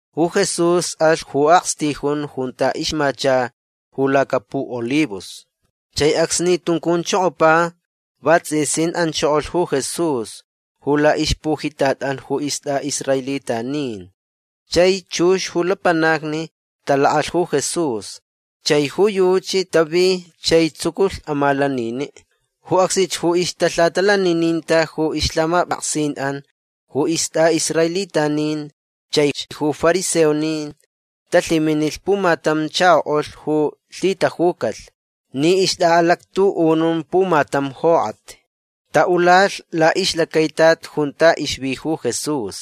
Ju Jesús alh ju akstijun junta ixmacha ju lacapuʼolivos. Chai acsni tuncunchokopa vatsʼisin anchokolh ju Jesús ju laʼixpujitatʼan ju istʼaʼisraelitanin. Chai chux ju lapanacni talakʼalh ju Jesús. Chai ju yuchi tavi chai tsuculh amalaniniʼ. Ju acsnich ju ixtalhatalanininta ju ixlhamapʼaksinʼan ju istʼaʼisraelitanin chaich ju fariseonin talhiminilh pumatam chakoʼulh ju lhitajucalh ni ixtʼaʼalactuʼunun pumatam jokʼat. Taʼulalh laʼixlacaitat junta ixvi ju Jesús.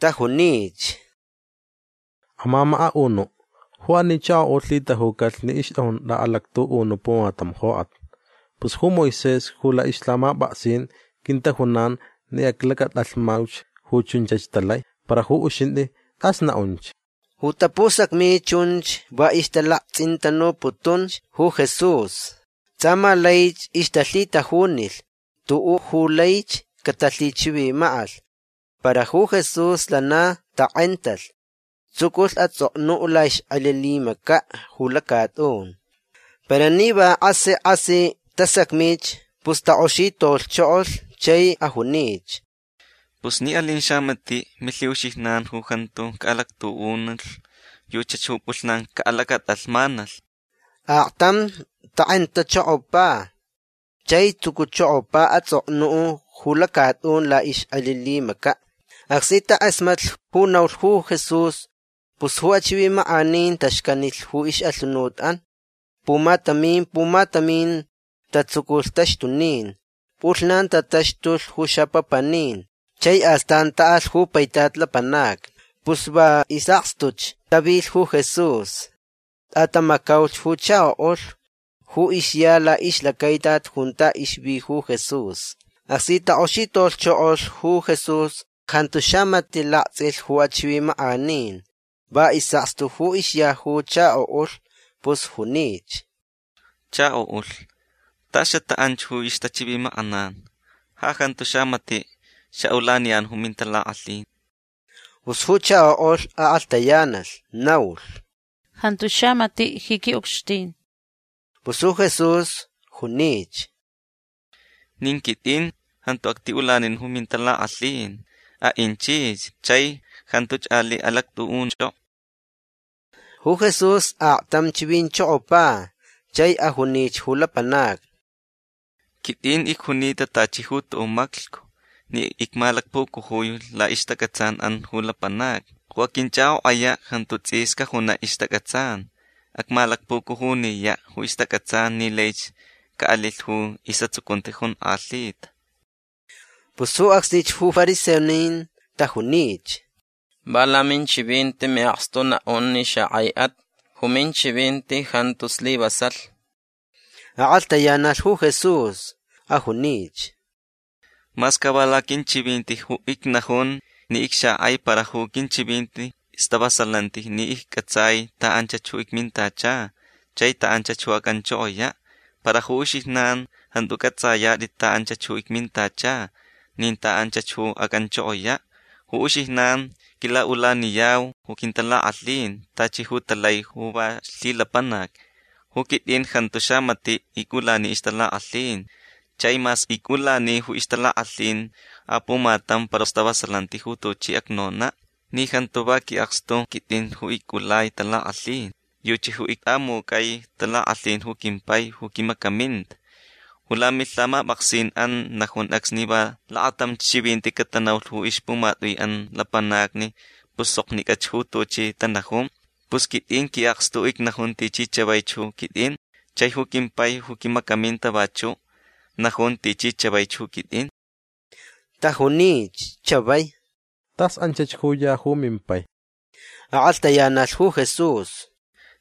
Tajunich: ―Amamakaʼunuʼ ju ani chakoʼulh lhitajucalh ni ixtʼajun tʼaʼalactuʼunuʼ pumatam jokʼat. Pus ju Moisés ju laʼixlhamapʼaksin quintajunan ni aclacatʼalhmauch ju chunchach talai. Para ju uxintʼi tʼas naʼunch. Ju tapusacmi chunch va ixtalaktsʼintanuputunch ju Jesús. Tsʼa ma laich ixtalhitajunilh tuʼuʼ ju laich catalhichivimakʼalh. Para ju Jesús lana takʼentalh. Tsuculh atsʼoknuʼ laʼixkʼelilimacaʼ ju lacatʼun. Para ni va kʼasi kʼasi tasacmich pus takʼoxitolhchokolh chai ajunich: ―Pus ni alin xamatiʼ milhiʼuxijnan ju jantu caʼalactuʼunulh yuchach ju pʼulhnanch caʼalacatʼalhmanalh. Aktam takʼentachokopa chai tsucuchokopa atsʼoknuʼ ju lacatʼun laʼixkʼelilimacaʼ. Acsni takʼasmatlh ju naulh ju Jesús pus ju achivimakʼanin taxcanilh ju ixʼalhunutʼan. Pumatamin pumatamin tatsuculh taxtunin. Pʼulhnan tataxtulh ju xapapanin. Chai astan taʼalh ju paitat lapanacni. Pus va isʼakstuch tavilh ju Jesús. Tʼatamacaulh ju chakoʼulh ju ixya laʼixlacaitat junta ixvi ju Jesús. Acsni takʼoxitolhchokolh ju Jesús jantu xamatiʼ laktsʼilh ju achivimakʼanin. Va isʼakstu ju ixya ju chakoʼulh. Pus junich: ―Chakoʼulh tas xataʼanch ju ixtachivimakʼanan. Ja jantu xamatiʼ xaʼulaniyan ju mintalakʼalhin. Pus ju chakoʼulh akʼalhtayanalh. Naulh: ―Jantu xamatiʼ ji quiʼucxtin. Pus ju Jesús junich: ―Nin quitʼin jantu actiʼulanin ju mintalakʼalhin. Aʼinchich chai jantuch aliʼ alactʼuʼunchʼokʼo. Ju Jesús aktam chivinchokopa. Chai ajunich ju lapanacni: ―Quitʼin icjunita tachi ju tuʼuʼ maclhcu ni icmalacpucujui laʼixtacʼatsanʼan ju lapanacni. Ju aquinchʼakʼokʼayaʼ jantu tsʼis cajunaʼ ixtacʼatsan. Acmalacpucujuniyaʼ ju ixtacʼatsan ni laich caʼalilh ju isʼatsucunti jonkʼalhita. Pus ju acsnich ju fariseonin tajunich: ―Va laminchivinti miʼakstu naʼun ni xakʼaiʼat. Ju minchivinti jantu slivasalh. Akʼalhtayanalh ju Jesús. Ajunich: ―Mas ca va laquinchivinti ju icnajun ni icxakʼai para ju quinchivinti stavasalanti ni iccʼatsai ta anchach ju icmintacha chai ta anchach ju acʼanchokoyaʼ. Para ju uxijnan jantu cʼatsʼayatʼit ta anchach ju icmintacha nin ta anchach ju acʼanchokoyaʼ. Ju uxijnan quilaʼulaniyau ju quintalakʼalhin tachi ju talai ju va lhilapanac. Ju quitʼin jantu xamatiʼ icʼulani ixtalakʼalhin. Chai mas icʼulani ju ixtalakʼalhin apumatam para stavasalanti ju tuchi acnonaʼ ni jantu va quiʼakstu quitʼin ju icʼulai talakʼalhin. Yuchi ju ictʼamucʼai talakʼalhin ju quimpai ju quimacaminta. Ju lamilhamapʼaksinʼan najun acsni va lakatamch chivinti catanaulh ixpumatʼuiʼan lapanacni pus soknicʼach ju tuchi tanajun. Pus quitʼin quiʼakstu icnajun tichi chavaich ju quitʼin. Chai ju quimpai ju quimacaminta vachuʼ najun tichi chavaich ju quitʼin. Tajunich chavai: ―Tas anchach ju ya ju mimpai. Akʼalhtayanalh ju Jesús: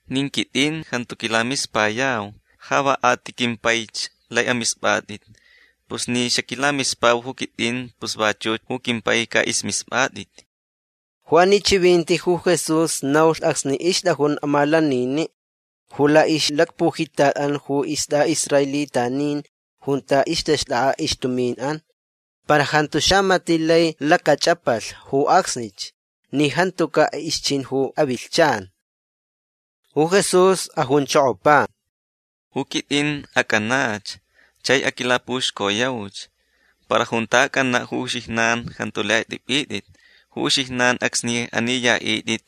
―Nin quitʼin jantu quilamispayau. Ja va a ti quimpaich lai amispʼatʼit. Pus ni xaquilamispau ju quitʼin pus vachuch ju quimpai caʼismispʼatʼit. Ju ani chivinti ju Jesús naulh acsni ixtʼajun amalaniniʼ ju laʼixlacpujitatʼan ju istʼaʼisraelitanin junta ixtaxtʼakʼa ixtuminʼan. Para jantu xamatiʼ lai lacachʼapalh ju acsnich ni jantucaʼ ixchin ju ixʼavilhchan. Ju Jesús ajunchokopa: ―Ju quitʼin acʼanach. Chai aquilapuxcoyauch. Para junta acʼanaʼ ju uxijnan jantu lai atʼipʼitʼit. Ju uxijnan acsni aniyaʼitʼit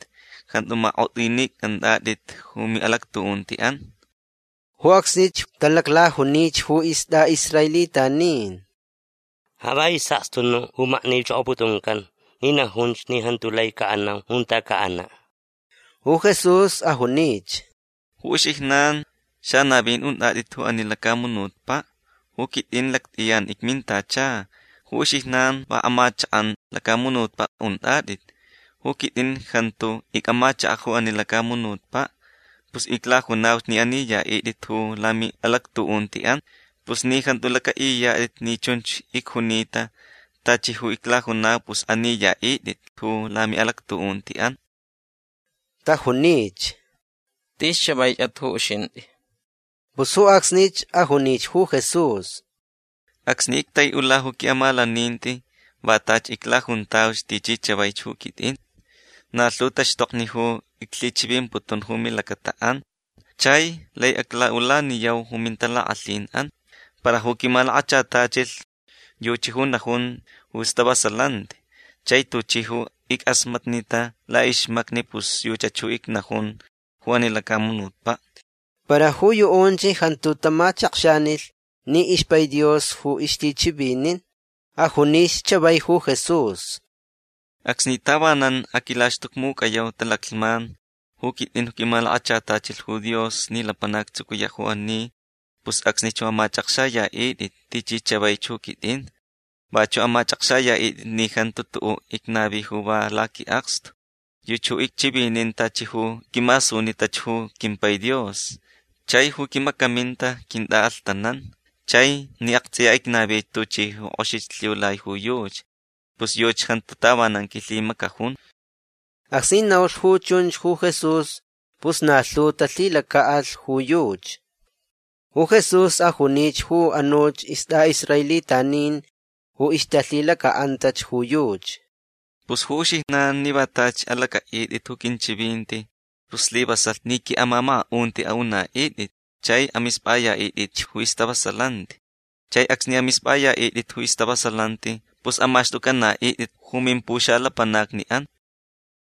jantu makʼotʼinicʼantʼatʼit ju miʼalactuʼuntiʼan. Ju acsnich talaclajunich ju istʼaʼisraelitanin: ―Ja va isʼakstu nuʼ ju maknichokoputuncan ni najunch ni jantu lai caʼanau junta caʼanaʼ. Ju Jesús ajunich: ―Ju uxijnan xanavin untʼatʼit ju ani lacamunutpaʼ. Ju quitʼin lactʼiyan icmintacha. Ju uxijnan va amachakʼan lacamunutpaʼ untʼatʼit. Ju quitʼin jantu icʼamachakaʼ ju ani lacamunutpaʼ. Pus iclajunauch ni aniyaʼitʼit ju lamiʼalactuʼuntiʼan. Pus ni jantu lacʼaʼiyatʼit ni chun icjunita tachi ju iclajunau pus aniyaʼitʼit ju lamiʼalactuʼuntiʼan. Tajunich: ―Tis chavaichʼat ju uxintʼi. Pus ju acsnich ajunich ju Jesús: ―Acsni ictaiʼula ju quiʼamalaninti va tachi iclajuntauch tichi chavaich ju quitʼin. Na lhu taxtokni ju iclhichivimputun ju milacataʼan chai lai aclaʼulaniyau ju mintalakʼalhinʼan. Para ju quimalakachatachilh yuchi ju najun ju stavasalanti. Chai tuchi ju ickʼasmatnita laʼixmacni pus yuchach ju icnajun ju ani lacamunutpaʼ. Para ju yuʼunch jantu tamachakxanilh ni ixpai Dios ju ixlhichivinin. Ajunich chavai ju Jesús: ―Acsni tavanan aquilaxtucmucʼayau talaclhman ju quitʼin ju quimalakachatachilh ju Dios ni lapanac actsucuyaʼ ju ani pus acsnich ju amachʼakxayaʼitʼit tichi chavaich ju quitʼin. Vachuʼ amachʼakxayaʼitʼit ni jantu tuʼuʼ icnavi ju va laquiʼakstu. Yuchi ju icchivinin tachi ju quimasunitach ju quimpai Dios. Chai ju quimacaminta quintʼaʼalhtanan. Chai ni aktsʼiya icnavich tuchi ju kʼoxich lhiulai ju yuchi pus yuchi jantu tavanan quilhimacajun. Acsni naulh ju chunch ju Jesús pus na lhu talhilacaʼalh ju yuchi. Ju Jesús ajunich ju anuch istʼaʼisraelitanin ju ixtalhilacaʼantach ju yuchi: ―Pus ju uxijnan ni va tachi alacʼaʼitʼit ju quinchivinti pus slivasalh ni quiʼamamakaʼunti aʼunaʼitʼit. Chai amispʼayaʼitʼitch ju istavasalanti. Chai acsni amispʼayaʼitʼit ju istavasalanti pus amaxtʼucʼanaʼitʼit ju mimpuxalapanacniʼan.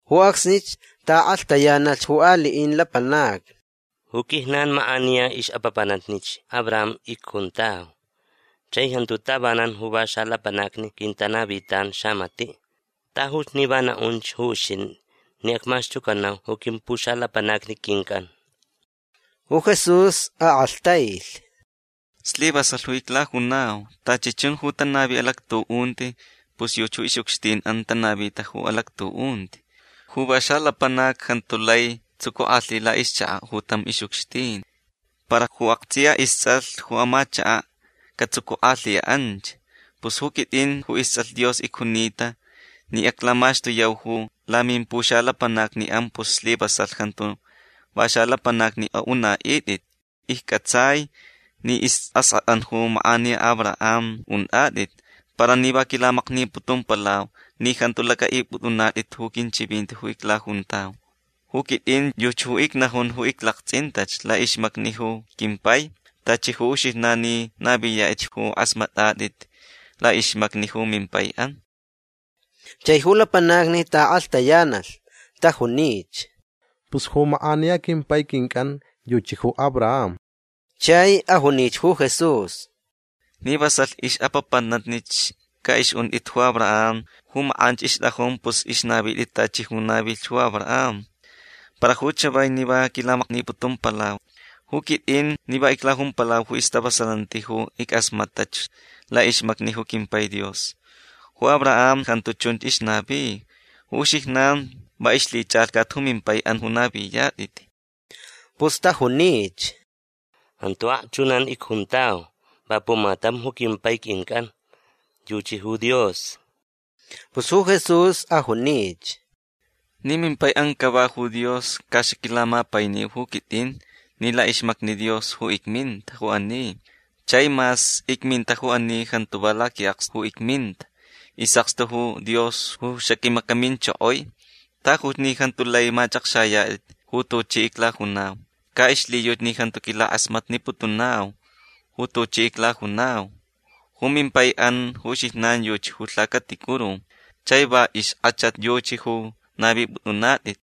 Ju acsni taʼakʼalhtayanalhch ju aliʼin lapanacni: ―Ju quijnan makʼaniya ixʼapapanatnich Abraham icjuntau. Chai jantu tavanan ju va xalapanacni quintanavitan xamatiʼ. Tajuch ni va naʼunch ju uxintʼi ni acmaxtucanau ju quimpuxalapanacni quincʼan. Ju Jesús akʼalhtailh: ―Slivasalh ju iclajunau. Tachi chun ju tanavi alactuʼunti pus yuchi ju ixʼucxtinʼan tanavita ju alactuʼunti. Ju va xalapanac jantu lai tsucukʼalhi ju laʼixchakaʼ ju tam ixʼucxtin. Para ju aktsʼiya istsʼalh ju amachakaʼ catsucukʼalhiyaʼ anch. Pus ju quitʼin ju istsʼalh Dios icjunita ni aclamaxtuyau ju lamimpuxalapanacniʼan pus slivasalhch jantu va xalapanacni aʼunaʼitʼit. Iccʼatsai ni isʼaskʼatʼan ju makʼaniya Abraham untʼatʼit. Para ni va quilamakniputumpalau ni jantu lacʼaʼipʼutʼunatʼit ju quinchivinti ju iclajuntau. Ju quitʼin yuchi ju icnajun ju iclaktsʼintach laʼixmacni ju quimpai. Tachi ju uxijnan ni naviyatʼitch ju kʼasmatʼatʼit laʼixmacni ju mimpaiʼan. Chai ju lapanacni taʼakʼalhtayanalh. Tajunich: ―Pus ju makʼaniya quimpai quincʼan yuchi ju Abraham. Chai ajunich ju Jesús: ―Ni vasalh ixʼapapanatnich caʼixʼuntʼit ju Abraham ju makʼanch ixtʼajun pus ixnavitʼit tachi ju navilh ju Abraham. Para ju chavai ni va quilamakniputumpalau. Ju quitʼin ni va iclajumpalau ju stavasalanti ju ickʼasmatʼach laʼixmacni ju quimpai Dios. Ju Abraham jantu chunch ixnavi. Ju uxijnan va ixlhichʼalhcat ju mimpaiʼan ju naviyatʼit. Pus tajunich: ―Jantu akchunan icjuntau. Va pumatam ju quimpai quincʼan. Yuchi ju Dios. Pus ju Jesús ajunich: ―Ni mimpaiʼan cava ju Dios ca xaquilamapainiu ju quitʼin ni laʼixmacni Dios ju icminta ju ani. Chai mas icminta ju ani jantu va laquiʼakstu ju icminta. Isʼakstu ju Dios ju xaquimacaminchokoi. Tajuch ni jantu lai machʼakxayatʼit ju tuchi iclajunau. Ca ixlhiyuchi ni jantu quilakʼasmatniputunau ju tuchi iclajunau. Ju mimpaiʼan ju uxijnan yuchi ju lhacaticuru. Chai va ixkʼachat yuchi ju navipʼutʼunatʼit.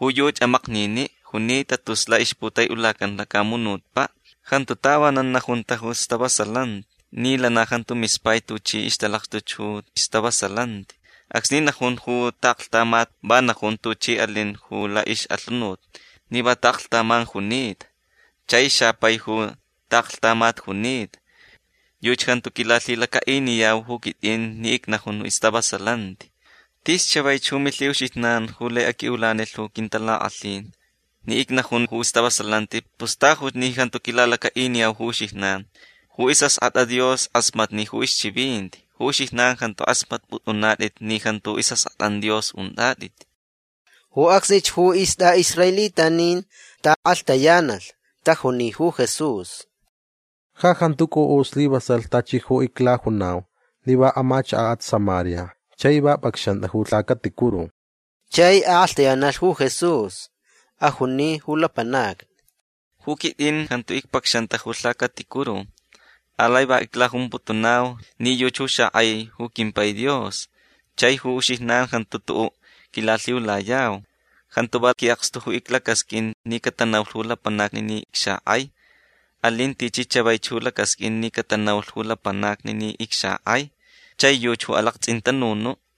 Ju yuchi amakniniʼ junita tus laʼixputaiʼulacan ju lacamunutpaʼ. Jantu tavanan najunta ju stavasalanti ni lana jantu mispai tuchi ixtalakxtuch ju stavasalanti. Acsni najun ju taʼaklhtamat va najun tuchi alin ju laʼixʼalhunut ni va taʼaklhtaman junita. Chai xapai ju taʼaklhtamat junita. Yuchi jantu quilalhilacaʼiniyau ju quitʼin ni icnajun ju istavasalanti. Tis chavaich ju milhiʼuxijnan ju lai aquiʼulanilh ju quintalakʼalhin. Ni icnajun ju stavasalanti pus tajuch ni jantu quilalacaʼiniyau ju uxijnan. Ju isʼaskʼatʼa Dios kʼasmatni ju ixchivinti. Ju uxijnan jantu kʼasmatpʼutʼunatʼit ni jantu isʼaskʼatʼan Dios untʼatʼit. Ju acsnich ju istʼaʼisraelitanin taʼakʼalhtayanalh. Tajuni ju Jesús: ―Ja jantu cʼuʼu slivasalh tachi ju iclajunau ni va amachakaʼat Samaria chai va pʼacxantʼa ju lhacaticuru. Chai akʼalhtayanalh ju Jesús. Ajuni ju lapanacni: ―Ju quitʼin jantu icpacxanta ju lhacaticuru. Alai va iclajumputunau ni yuchi ju xakʼai ju quimpai Dios. Chai ju uxijnan jantu tuʼuʼ quilalhiulayau. Jantu va quiʼakstu ju iclacasqʼuin ni catanaulh ju lapanacni ni icxakʼai. Alin tichi chavaich ju lacasqʼuin ni catanaulh ju lapanacni ni icxakʼai. Chai yuchi ju alaktsʼintanunuʼ.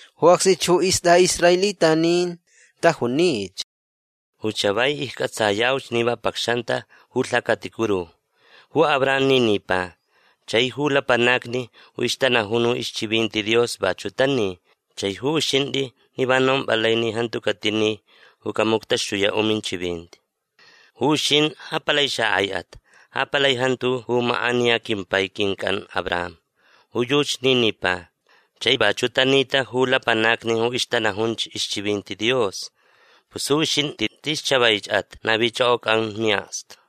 Ju acsnich ju istʼaʼisraelitanin tajunich: ―Ju chavai iccʼatsayauch ni va pʼacxantʼa ju lhacaticuru. Ju Abraham ni nipa. Chai ju lapanacni ju ixtanajun ju ixchivinti Dios vachuʼ tani. Chai ju uxintʼi ni va nompʼalai ni jantu catini ju camuctaxtuyaʼ ju minchivinti. Ju uxintʼi ja palai xakʼaiʼat. Ja palai jantu ju makʼaniya quimpai quincʼan Abraham. Ju yuchi ni nipa. Chai vachuʼ tanita ju lapanacni ju ixtanajunch ixchivinti Dios. Pus ju uxintʼi tis chavaichʼat navichʼokʼocʼan miʼakstu.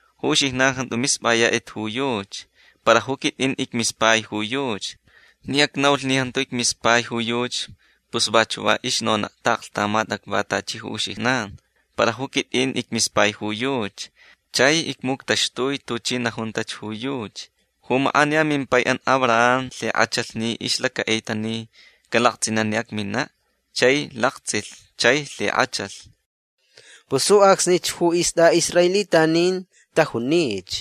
Ju uxijnan jantu mispʼayatʼit ju yuchi. Para ju quitʼin icmispai ju yuchi. Ni acnaulh ni jantu icmispai ju yuchi pus vachuʼ va ixnonaʼ taʼaklhtamat acva tachi ju uxijnan. Para ju quitʼin icmispai ju yuchi. Chai icmuctaxtuich tuchi najuntach ju yuchi. Ju makʼaniya mimpaiʼan Abraham lhikʼachalh ni ixlacaʼita ni calaktsʼinaʼ ni acminaʼ. Chai laktsʼilh. Chai lhikʼachalh. Pus ju acsnich ju istʼaʼisraelitanin tajunich: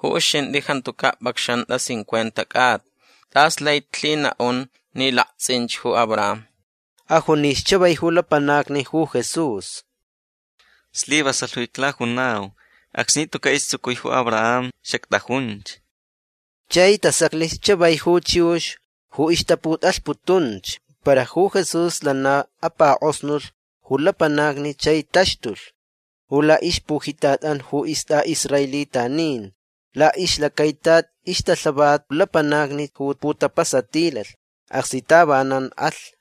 ―Ju uxintʼi jantucaʼ pʼacxantʼa cincuenta cʼata. Tʼas laich lhinaʼun ni laktsʼinch ju Abraham. Ajunich chavai ju lapanacni ju Jesús: ―Slivasalh ju iclajunau. Acsni tucaʼ istsucui ju Abraham xactʼajunch. Chai tasaclich chavai ju chiux ju ixtaputʼalhputunch. Para ju Jesús lana apakʼosnulh ju lapanacni chai taxtulh ju laʼixpujitatʼan ju istʼaʼisraelitanin. Laʼixlacaitat ixtalhavat lapanacni ju putapasatilalh acsni tavanan alh.